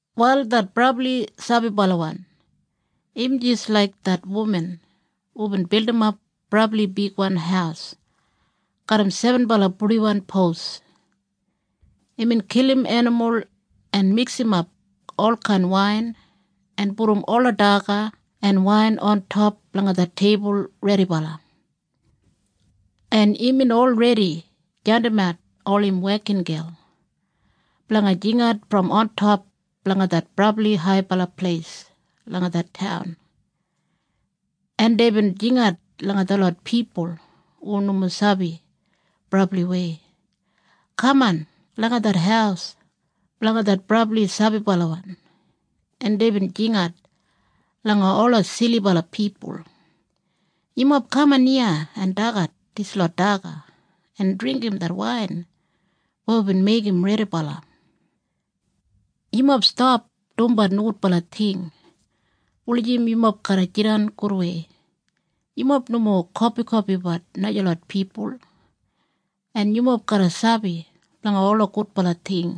Wal det brabli sabibalawan im jis laik det wuman hubin bildimap brabli bigwan haus garram sebenbala purdiwan pos. Imbin kilim enimul en miksimap olkain wain en pudum ola daga en wain ontop langa det teibul redibala. En imbin olredi jandimat ol im wekingel blanga jingat brom ontop blanga det brabli haibala pleis langa det taun. En deibin jingat langa detlot pipul hu nomo sabi brabliwei, “Kaman langa det haus blanga det brabli sabibalawan.” En deibin jingat langa ola silibala pipul, “Yumob kaman iya en dagat dislot daga en dringgim det wain weya wibin meigim redibala. Yumob stap dumbat nogudbala ting wulijim yumob garra jidan gudwei. Yumob nomo kopikopibat najalot pipul en yumob garra sabi blanga ola gudbala ting.”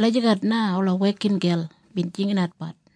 Lagijat na ola wekingel bin jinginatbat.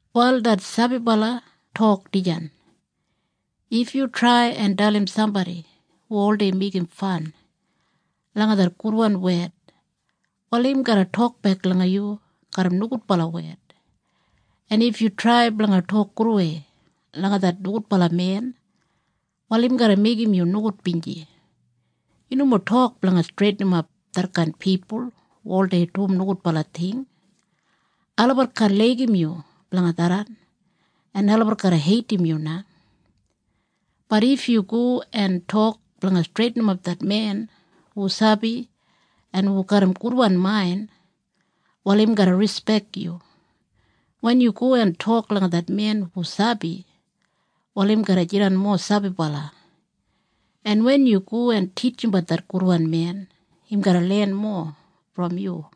Wal det sabibala tok dijan, “If yu trai en dalim sambodi hu oldei meigim fan langa det gudwan wed, wal im garra tokbek langa yu garram nogudbala wed, en if yu trai blanga tok gudwei langa det nogudbala men, wal im garra meigim yu nogudbinji. Yu nomo tok blanga streitinimap detkain pipul hu oldei dum nogudbala ting. Olabat kaan laigim yu blanga tharran en olabat garra heidim yu na. Bat if yu go en tok blanga streitinimap det men hu sabi en hu garram gudwan main, wal im garra rispek yu. Wen yu go en tok langa det men hu sabi, wal im garra jidan mowa sabibala. En wen yu go en titjimbat det gudwan men, im garra len mowa brom yu.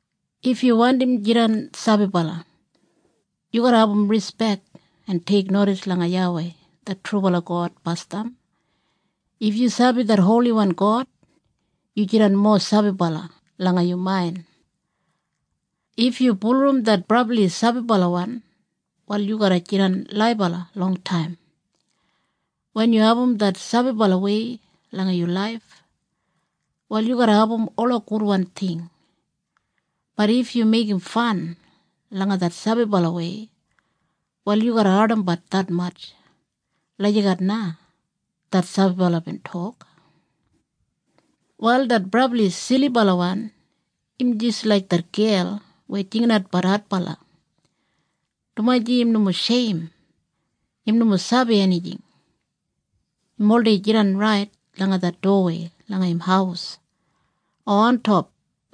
“If yu wandim jidan sabibala, yu garra abum rispek en teiknodis langa YAWEI det trubala God basdam. If yu sabi det Holiwan God, yu jidan mowa sabibala langa yu main. If yu bulurrum det brabli sabibalawan, wal yu garra jidan laibala longtaim. Wen yu abum det sabibalawei langa yu laif, wal yu garra abum ola gudwan ting, bat if yu meigim fan langa det sabibalawei, wal yu garra ardimbat detmatj.” Lagijat na det sabibala bin tok. Wal det brabli silibalawan im jis laik det gel weya jinginatbat adbala, dumaji im nomo sheim. Im nomo sabi enijing. Im oldei jidan rait langa det dowawei langa im haus o ontop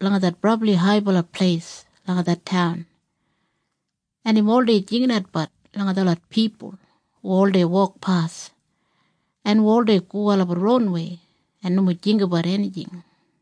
langa det brabli haibala pleis langa det taun, en im oldei jinginatbat langa detlot pipul hu oldei wokpas en hu oldei go olabat ronwei en nomo jinggabat enijing.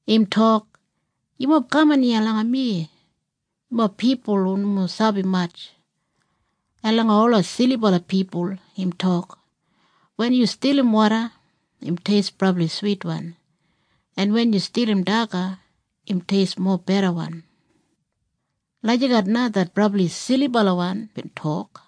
Im tok, “Yumob kaman iya langa mi, yumob pipul hu nomo sabi matj.” En langa ola silibala pipul im tok, “Wen yu stilim woda im teist brabli switwan, en wen yu stilim daga, im teist mobedawan.” Lagijat na det brabli silibalawan bin tok.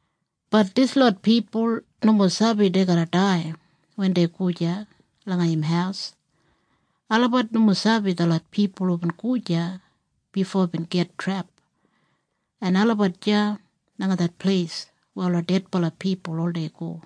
Bat dislot pipul nomo sabi dei garra dai wen dei go deya langa im haus. Olabat nomo sabi detlot pipul hubin go deya bifo bin git trep en olabat deya langa det pleis weya ola dedbala pipul oldei go.